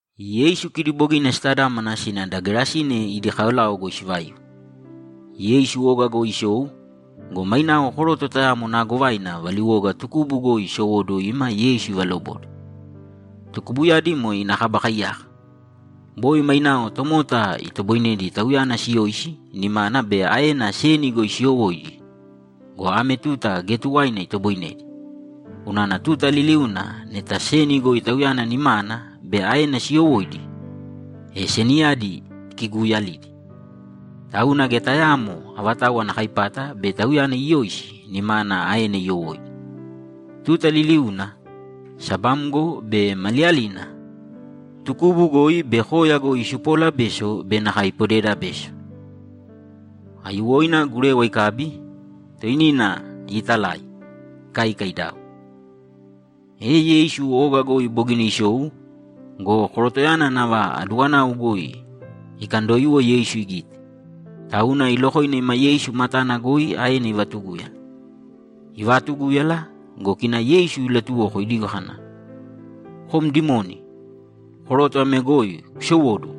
Yeisu kidi bogina sitadámana sina da Gerasine idi kaolao goi sivaiu. Yeisu oga goi isou go, mainao koroto tayamo naagovaina valiwoga tukubu goi isowóduwo ima Yeisu ivalobode. Tukubuyadi moe ina kaba kaiyaka. Boi mainao tomota itoboinedi tauyana siyoisi nimana be aena seni goi siiyowóidi go, ame tuta geya tuwaina itoboinedi. Unana tuta liliuna neta seni goi tauyana nimana be aena siiyowóidi, e seniyadi ikiguuyalidi. Tauna geya tayaamo avatau ana kaipata bei tauyana iyoisi nimana aena iyowóidi. Tuta liliuna, sabamgo be maliyalina, tukubu goi be koya goi isupoola beso be nakae ipodeeda beso. Aiyuwoina gurewa ikabi, toinina iitalai, ikaika idau. E Yeisu oga goi bogina isou go, korotoyana nava aduwanau goi ikandoiwo Yeisu igite, tauna ilokoina ima Yeisu matana goi aena ivatugúyala. Ivaatugúyala go, kina Yeisu ilatuwoko idigo kana, ‘Kom dimoni, koroto ame goi kusowōduwo!’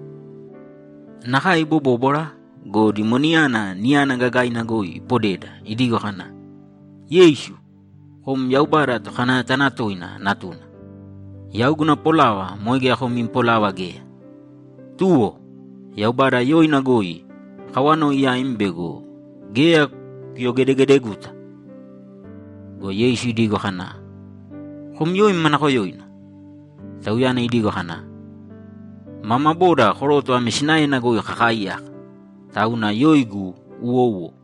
Nakae ibobóbwara go, dimoniyana niyana gagaina goi ipodeda, idigo kana, ‘Yeisu, kom Yaubada Tokanayatanatoina Natuna, yau guna polava moe geya kom im polava geya. Tuwo! Yaubada yoina goi akawanoi yaim bego geya kuyogedegedeguta!’ Go Yeisu idigo kana, ‘Kom yoim manakoyoina?’ Tauyana idigo kana, ‘Mama boda koroto ame sinaena goi kakaaiyaka. Tauna yoigu Uwouwo.’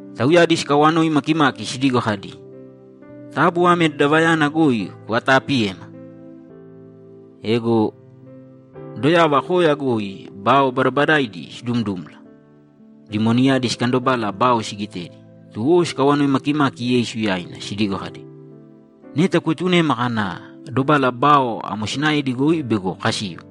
Tauyadi sikawanoi makimaki sidigo kadi, ‘Taabu ame dadavayana goi kuvataapiyēma!’ Ego doyava koya goi bao badabadaidi sidumdumla. Dimoniyadi sikandobala bao sigitedi, tuwo sikawanoi makimaki Yeisu yaina sidigo kadi, ‘Neta kuetunēma kāna dobala bao amo sinaedi goi bego kasiu.’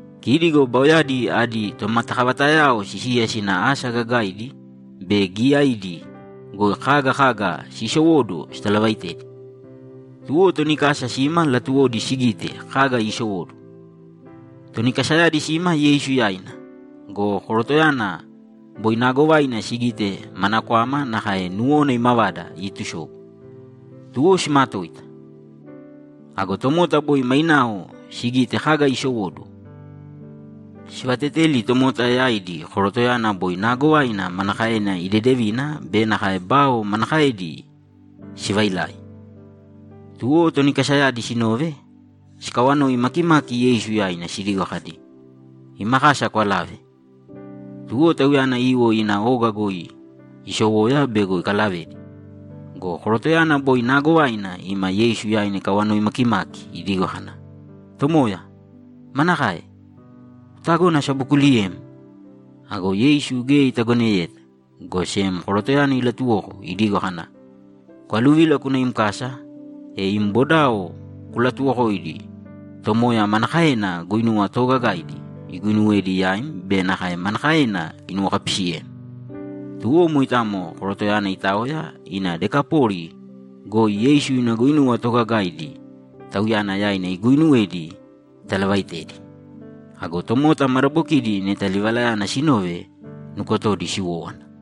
Kidi go baoyadi adi tomatakavatayao sisiya sina asa gagaidi be giyaidi goi kaga kaga siisowóduwo sitalavaitedi. Tuwo toni kasa sima latuwodi sigite kaga iisowóduwo. Toni kasayadi sima Yeisu yaina go, korotoyana boi naagovaina sigite mana kwama nakae nuwona imavada iitusobu. Tuwo simatoita. Ago tomota boi mainao sigite kaga isowóduwo, sivateteli tomota yaidi korotoyana boi naagovaina manakaena idedevina be nakae bao manakaedi sivailai. Tuwo toni kasayadi sinove, sikawanoi makimaki Yeisu yaina sidigo kadi, ‘Ima kasa kwalāve.’ Tuwo Tauyana iiwo ina oga goi iisowoya bego ikalavedi go, korotoyana boi naagovaina ima Yeisu yaina ikawanoi makimaki idigo kana, ‘Tomoya, manakae? Kutagona asabokuuliyem?’ Ago Yeisu geya itagoneyeta, go sem korotoyana ilatuwoko idigo kana, ‘Kwaluvīla kūna im kasa, e im bodao kulatuwokōidi Tomoya manakaena guinuwa toogagaidi iguinuwedi yaim be nakae manakaena inuwokapisiyem.’ Tuwo moitamo korotoyana itaoya ina Dekapoli goi Yeisu ina guinuwa toogagaidi tauyana yaina iguuinuwedi italavaaitedi. Ago tomota madabokidi neta livalayana sinove, nukotodi siwówana.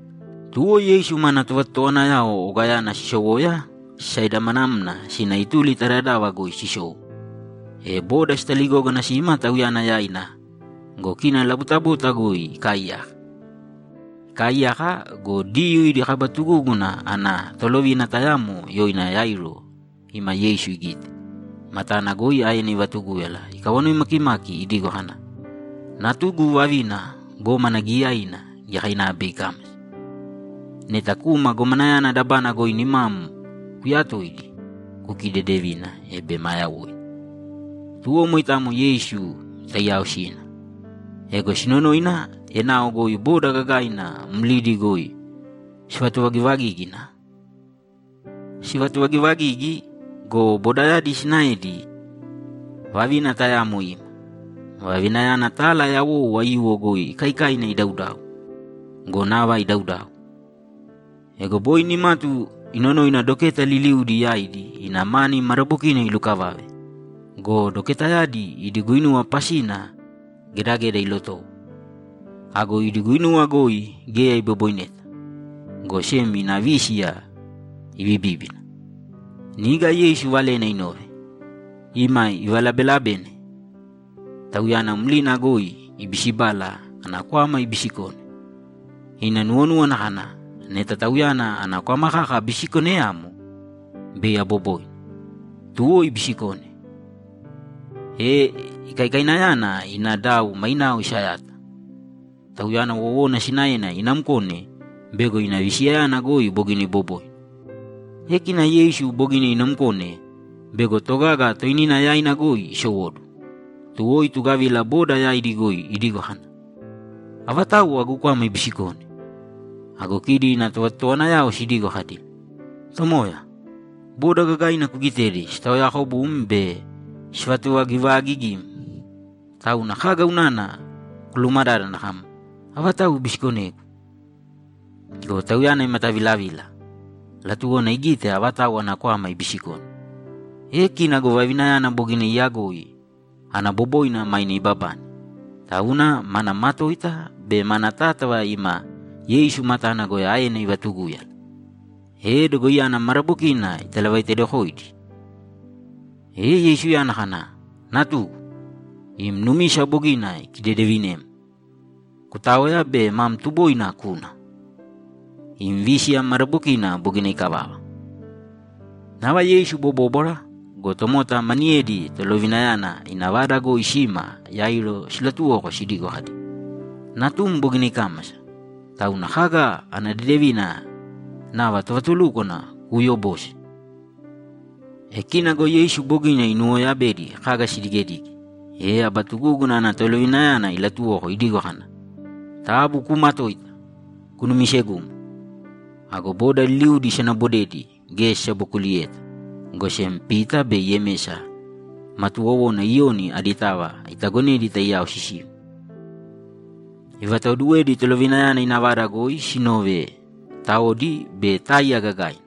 Tuwo Yeisu mana tovatotowanayao ogayana sisowoya, sisaidamanamna sina ituli ta dadava goi sisou, e boda sitaligógana sima Tauyana yaina go, kina labutabuta goi ikaaiyaka. Ikaaiyaka go, Diyuu idi kaba tugúguna ana tolovina tayamo yoina Yairo ima Yeisu igite, matana goi aena ivatugúyala ikawanoi makimaki idigo kana, ‘Natugu vavina gómana giyaina giyakainava bei ikámasa. Neta kūma gomanayana dabana goi nimam kuyatōidi, kukidedevīne, e bei ma yawoina.’ Tuwo moitamo Yeisu taiyao sina. Ego sinonoina, enao goi boda gagaina mlidi goi sivatuvagivagígina. Sivatuvagivagigi go, bodayadi sinaedi vavina tayamo ima. Vavinayana tala yawou aiyuwo goi ikaikaina idaudau go, nava idaudau. Ego boi nimatu inonoina doketa liliudi yaidi ina mani madabokina ilukavave go, doketayadi idi guinuwa pasina gedageda ilotowo. Ago idi guinuwa goi geya iboboineta, go sem ina vísiya ibibíbina. Niga Yeisu valena inove, ima ivalabelabena Tauyana mlina goi ibisibala ana kwama ibisikone. Ina nuwonúwana kana, ‘Neta Tauyana ana kwama kaka abisikoneyamo, bei aboboina.’ Tuwo ibisikone, e ikaikainayana ina dau mainao isayata. Tauyana wowona sinaena inamkone bego ina visiyayana goi bogina iboboina. E kina Yeisu bogina inamkone bego togaga toinina yaina goi isowóduwo, tuwo itugavila boda yaidi goi idigo kana, ‘Avatau agu kwama ibisikone?’ Ago kidi ina tovatotowanayao sidigo kadi, ‘Tomoya, boda gagaina kugitedi sitaoyaakobum be sivatuvagivaagigim, tauna kaga unana kulumadádana kam, “Avatau ibisikonegu?”’ Go Tauyana imatavilavila; latuwona igite avatau ana kwama ibisikone. E kina go vavinayana bogina iyagoi ana boboina maine ibabane, tauna mana matoita be mana tátava ima Yeisu matana goi aena ivatugúyala, e dogoiyana madabokina italavaitedokoidi. E Yeisuyana kana, ‘Natugu, im numisa bogina ikidedevinem. Kutāoya be mam tuboina kūna. Im vísiya madabokina bogina ikavava.’ Nava Yeisu ibobóbwara go, tomota maniyedi tolovinayana ina vada goi sima Yairo silatuwoko sidigo kadi, ‘Natum bogina ikámasa, tauna kaga ana dedevina nava tovatulúkwana kuuyobose?’ E kina go Yeisu bogina inowoyabedi kaga sidigedige, e aba tugúguna ana tolovinayana ilatuwoko idigo kana, ‘Taabu kuumatōita. Kunumisegūmo.’ Ago boda liliuna isanabodedi geya sisabokuliyeta, go sem Pita be Yemesa ma tuwowona Iyoni aditava itagonedi taiyao sisiu. Ivataoduwedi tolovinayana ina vada goi sinove taodi be táiya gagaina.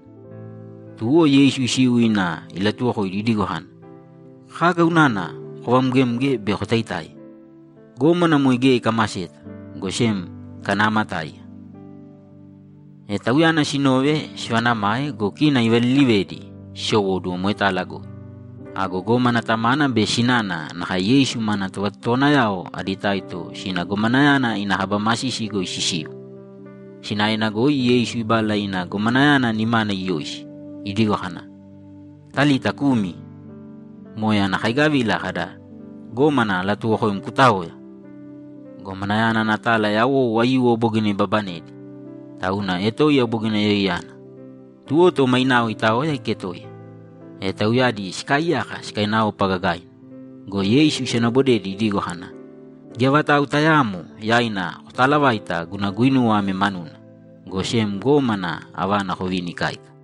Tuwo Yeisu isiu ina ilatuwokoidi idigo kana, ‘Kaga unana kovamgemge be kotaitáiya? Gómana moe geya ikamaseta, go sem ikanaamatáiya.’ E Tauyana sinove, sivaanamae go, kina ivalilivedi sisowóduwo moetala goi. Ago gómana tamana be sinana nakae Yeisu mana tovatotowanayao adi taito sina gomanayana ina kaba masisi goi sisiu. Sinaena goi Yeisu ibala ina gomanayana nimana iyoisi, idigo kana, ‘Talita kumi!’ Moe ana kaigavila kada, ‘Gómana alatuwokoim kutāoya!’ Gomanayana ana tala yawou aiyuwo bogina ibabanedi, tauna etoiya bogina yoiyana. Tuwo to mainao itaoya iketoiya. E tauyadi sikaaiyaka sikainaopa gagaina. Go Yeisu isanabodedi idigo kana, ‘Geya vatau tayaamo yaina kotaalavāita guna guinuwa ame manuna, go sem gómana avana kovīni ikáika.’